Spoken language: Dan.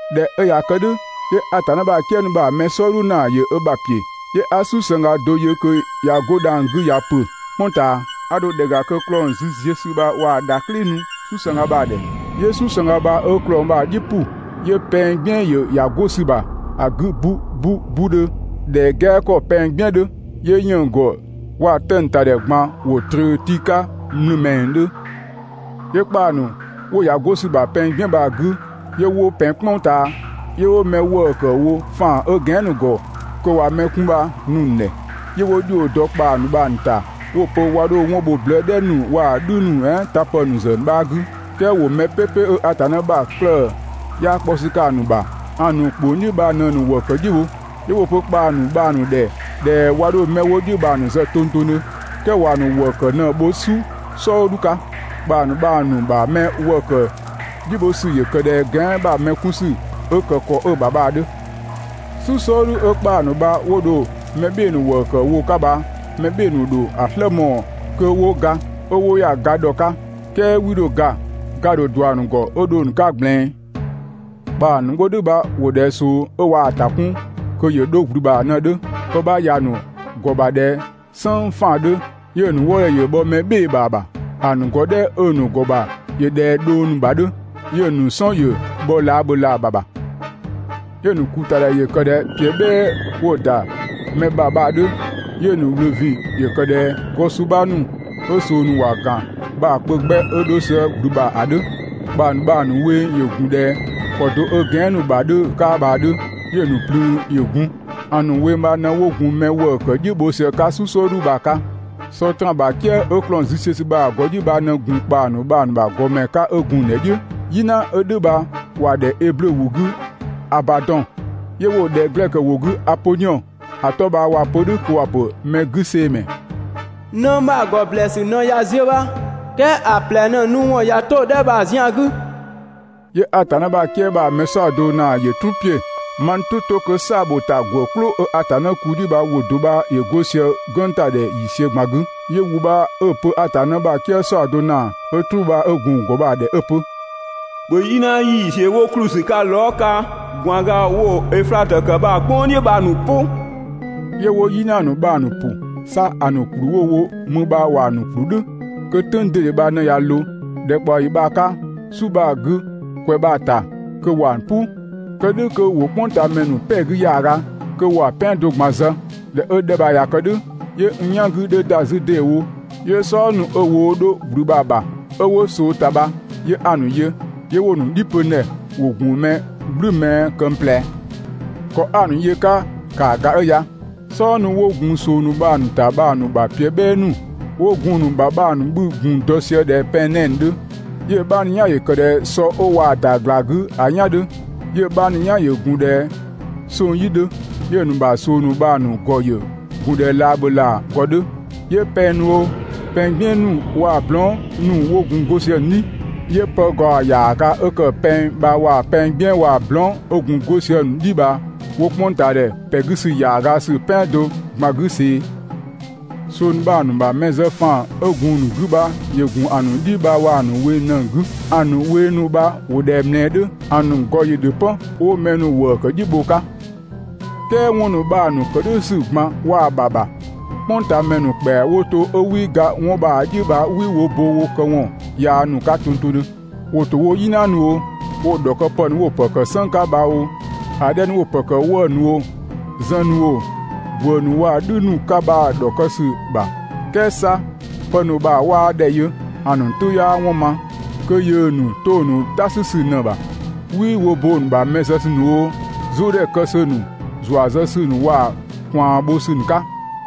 ꞊Dhɛ 'ö ꞊ya kë "dhʋ̈, 'yö Atanna ‑bha "kië ‑nu bha‑ mɛ "sɔɔdhu ‑naa ‑yö ö ‑bha ‑piö. 'Yö 'a "susëngga do yö kö ꞊ya 'go dhang‑ 'gü ꞊ya ‑pö "kpʋng ꞊taa. 'A 'dho ‑dhɛ ‑ga kö ‑klɔng züziösü bha ꞊waa‑ ‑dhaklɩ nu "susëngga bha‑ ‑dhɛ. 'Yö "susëngga bha 'ö ‑klɔng bha‑ "dhi ‑pʋ, 'yö pɛng "gbiën ‑yö ‑ya 'go ‑sü ‑bha ‑a 'gü 'bu 'bu 'budhö ꞊dhɛ "gɛa 'kɔ pɛng "gbiën 'dhö, 'yö 'yënng‑ ‑gɔ waa‑ 'tëng‑ ‑ta ‑dhɛ ꞊gban ‑wo ꞊tröö tii 'ka mlumɛngdhö. 'Yö ‑kpaa ‑nu 'wo ‑ya 'go ‑sü ‑bha pɛng "gbiën bha‑ 'gü 'yö 'wo ‑pɛn "kpʋng ꞊taa. 'Yö 'wo mɛ ‑wëë ‑kë wo ‑faan 'ö gɛan"‑ ‑nu ‑gɔ kö ꞊wa mɛ 'kun bha‑ nu‑ ‑nu ‑dhɛ. 'Yö 'wo ‑dhio dɔ ‑kpaa ‑nu bha‑ ‑nu ‑ta 'wo‑ pö 'wa 'dho 'wɔn bho blëë "dhɛ ‑nu waa‑ "dhü ‑nu "ɛɛn tapë ‑nu ‑zë 'bha 'gü, "kɛɛ ‑wo mɛ "pɛpɛ 'ö Atanna ‑bha 'klëë‑ 'yaa 'kpɔ ‑sü 'ka‑ ‑nu ‑bha ‑a ‑nu ‑kpong "dhiʋ̈ bha ꞊në‑ ‑nu ‑wëë ‑kë "dhiʋ̈ bho. 'Yö 'wo‑ pö ‑kpaa ‑nu bha‑ ‑nu ‑dhɛ ꞊dhɛ 'wa 'dho 'mɛ 'wo "dhʋ̈ bha‑ 'bha zë tongtongdhö, "kɛɛ ‑wa ‑nu ‑wëë ‑kë ꞊në‑ bho "su "sɔɔdhu 'ka. ‑Kpaa ‑nu bha‑ ‑nu ‑bha mɛ ‑wëë ‑kë "dhiʋ̈ bho ‑sü ‑yö ‑kë ꞊dhɛ gɛan" ‑bha mɛ 'kun ‑sü 'ö ‑kë ‑kɔ 'ö‑ ‑bha bha‑ 'dhö. "Su "sɔɔdhu 'ö ‑kpaa ‑nu bha 'wo dho mɛ "bhɩɩ‑ ‑nu ‑wëë ‑kë wo‑ ‑ka bha mɛ "bhɩɩ‑ ‑nu ‑dho ‑a "slë mɔɔ‑ kö 'wo ga, 'ö 'wo ‑ya ga ‑dhɔ 'ka, "kɛɛ 'wii 'dho ga, ga‑ ‑dho ꞊dua‑ ‑nu ‑gɔ 'ö dho‑ ‑nu 'ka ꞊gblɛɛn. ‑Kpaa ‑nu 'wo "dhʋ̈ bha ‑wo ꞊dhɛ ꞊soo 'ö ꞊waa‑ ‑ta 'kun kö ‑yö 'dho ‑gblü ‑bha ꞊në‑ 'dhö. Pë 'bha ‑ya ‑nu ‑gɔ ‑bha ꞊dhɛ "sënng 'faan‑ 'dhö, 'yö‑ ‑nu wëëdhɛ ‑yö bhɔ mɛ "bhɩɩ‑ ‑bha ‑bha. ‑A ‑nu ‑gɔ "dhɛ 'ö‑ ‑nu ‑gɔ ‑bha ‑yö ꞊dhɛ dhong ‑nu ‑bha 'dhö 'yö‑ ‑nu "sɔn ‑yö bhɔ laabhölaa ‑bha ‑bha. 'Yö‑ ‑nu ‑kuutadhɛ ‑yö ‑kë ꞊dhɛ ‑piö "bhɛɛ 'wo ‑da mɛ ‑bha bha‑ 'dhö. 'Yö‑ ‑nu ‑wlö ‑vin ‑yö ‑kë ꞊dhɛ gɔ suu 'bha ‑nu 'ö ꞊soo ‑nu ‑wa ‑gan bha‑ kpö 'gbɛ 'ö 'dho sië ‑gblü bha ‑a 'dhö. ‑Kpaa ‑nu bha‑ ‑nu weng ‑yö ‑gun ꞊dhɛ ‑kɔ do 'ö gɛan" ‑nu ‑bha 'dhö‑ 'ka bha‑ 'dhö, 'yö‑ ‑nu "plüün ‑yö gun. ‑A ‑nu weng bha ꞊në 'wo gun mɛ ‑wëë ‑kë "dhiʋ̈ bho sië‑ 'ka "su "sɔɔdhu bha‑ 'ka. Sɔtraan ‑bha "kië 'ö ‑klɔng züziösü bha‑ ‑gɔ "dhiʋ̈ bha ꞊në gun ‑kpaa ‑nu bha‑ ‑nu ‑gɔmɛ 'ka 'ö gun‑ ‑nu ‑dhɛ "dhiʋ̈. "Yina 'ö "dhʋ̈ bha ‑wa ‑dhɛ Eblö ‑wʋ 'gü «Abadɔn». 'Yö 'wo‑ ‑dhɛ glɛkö ‑wʋ 'gü «Apodhiɔn» ‑a 'tɔ bha waa‑ pö "dhʋ̈ kö ‑wa pö «mɛgüseemɛ». Nëng bha‑ ‑gɔ ‑blɛɛsü ꞊në ꞊ya ziö bha, "kɛɛ ‑a ꞊plɛ ꞊në‑ nu ‑wɔn ꞊ya 'to‑ 'dhɛ bha‑ zian 'gü. 'Yö Atanna ‑bha "kië ‑nu bha‑ mɛ "saɔdo ‑naa ‑yö "truu ‑piö. Maa n "tʋ 'to kö "saabhotagwë "klʋ 'ö Atanna ‑kuu "dhiʋ̈ bha ‑wʋ do 'bha ‑yö 'go sië‑ "gwënng ‑ta ‑dhɛ ‑yiisiö ꞊gban 'gü. 'Yö ‑wʋ bha 'ö‑ pö Atanna ‑bha "kië "saɔdo ‑naa 'ö "truu bha 'ö gun‑ ‑gɔ bha‑ ‑dhɛ 'ö‑ pö: «‑Bhö "yina ‑yiisiö 'wo ‑kplü ‑sü 'ka lɔɔ" 'ka ꞊gwaanga 'wo‑ Öflatö ‑kë bha‑ "kpʋng "dhiʋ̈ bha‑ ‑nu "pʋ!» 'Yö 'wo "yina ‑nu bha‑ ‑nu ‑pʋ. 'Sa ‑a ‑nu ‑kplü 'wo‑ wo mü bha ‑wa ‑nu ‑kplü "dhʋ̈ kö "tʋ̈ng ꞊dede bha ꞊në ꞊ya ꞊loo ‑dhɛkpaɔyi bha‑ 'ka, "su bha‑ 'gü, ‑kwɛ bha‑ ‑ta, kö ‑wa "pʋ, kë "dhʋ̈ kö ‑wo "kpʋngtaamɛ ‑nu "pɛ‑ 'gü ‑yaaga, kö ‑wa "pɛando ꞊gban zë. ꞊Dhɛ 'ö‑ 'dhɛ bha ꞊ya kë "dhʋ̈, 'yö n "yan 'gü 'dhö ‑da 'zü ‑deewo, 'yö "sɔdha ‑nu 'ö woo 'dho ‑gblü bha‑ ‑bha 'ö 'wo ꞊soo ‑ta bha 'yö 'a‑ ‑nu yö. 'Yö 'wo‑ ‑nu "dhi pö n ‑dhɛ. ‑wo ‑gun mɛ "gblü mɛɛ këng ꞊plɛ. ‑Kɔ 'a‑ ‑nu yö‑ 'ka ‑kaa ‑ga 'ö ya: "Sɔdha ‑nu 'wo gun ꞊soo ‑nu bha‑ ‑nu ‑ta bha‑ ‑nu ‑bha ‑piö "bhɛɛ ‑nu 'wo gun‑ ‑nu ‑bha bha‑ 'bhü‑ ‑gun dɔ sië ꞊dhɛ pɛng 'nɛɛ‑ 'dhö, 'yö‑ 'bha ‑nu "yan ‑yö ‑kë ꞊dhɛ sɔ 'ö ꞊waa‑ ‑da ꞊gla 'gü ‑a "yan 'dhö, 'yö‑ 'bha ‑nu "yan ‑yö gun ꞊dhɛ 'song‑ "yi 'dhö. 'Yö‑ ‑nu ‑bha ꞊soo ‑nu bha‑ ‑nu ‑gɔ ‑yö gun ꞊dhɛ laabhölaa ‑gɔ 'dhö. 'Yö pɛng ‑nu oo, pɛng "gbiën ‑nu waa‑ blɔɔn" ‑nu 'wo gun 'go sië‑ ‑nu "dhi. 'Yö pë ‑gaɔ ‑yaaga 'ö ‑kë pɛng bha waa‑ "gbiën waa‑ blɔɔn" 'ö gun 'go sië‑ ‑nu "dhi bha 'wo "kpʋngtaadhɛ ‑pɛ 'gü ‑yaaga ‑sü "pɛando ꞊gban 'gü see‑. ꞊Soo ‑nu bha‑ ‑nu ‑bha mɛ zë ‑faan 'ö gun‑ ‑nu 'gü bha ‑yö ‑gun ‑a ‑nu "dhi bha waa‑ ‑nu weng ꞊në‑ 'gü. ‑A ‑nu weng ‑nu bha ‑wo ꞊dhɛ ꞊mlɛɛ 'dhö, ‑a ‑nu ‑gɔ ‑yö ‑dhö 'pö 'wo mɛ ‑nu ‑wëë ‑kë "dhiʋ̈ bho‑ 'ka. "Kɛɛ 'wɔn ‑nu bha‑ ‑nu ‑kë "dhʋ̈ ‑sü ꞊gban waa‑ ‑bha ‑bha, "kpʋngtaamɛ ‑nu ‑kpɛa 'wo to 'ö 'wii ga 'wɔn bha‑ "dhiʋ̈ bha 'wii wo bo wo këwɔn yaa ‑nu 'ka tongtongdhö. ‑Wo ‑to woo‑ "yina ‑nu oo, woo‑ ‑dhɔkëpë ‑nu 'wo‑ ‑pë ‑kë "sënng 'ka bha oo, ‑a 'dhɛ ‑nu 'wo‑ ‑pë ‑kë 'wëë‑ ‑nu oo, zën ‑nu oo, ‑gwë ‑nu waa‑ "dhü ‑nu 'ka bha‑ ‑dhɔkë ‑sü ‑bha, "kɛɛ 'sa kö pë ‑nu bha 'waa ‑dhɛ yö, ‑a ‑nu "tʋ 'yaa 'wɔn ma, kö yöö ‑nu 'to‑ ‑nu "ta 'sü ‑sü ꞊në‑ ‑bha. 'Wii wo bo‑ ‑nu ‑bha mɛ zë ‑sü ‑nu oo, "zʋʋdhɛ kë ‑sü ‑nu, ‑zua zë ‑sü ‑nu waa‑ ꞊kwaan‑ bho ‑sü ‑nu 'ka.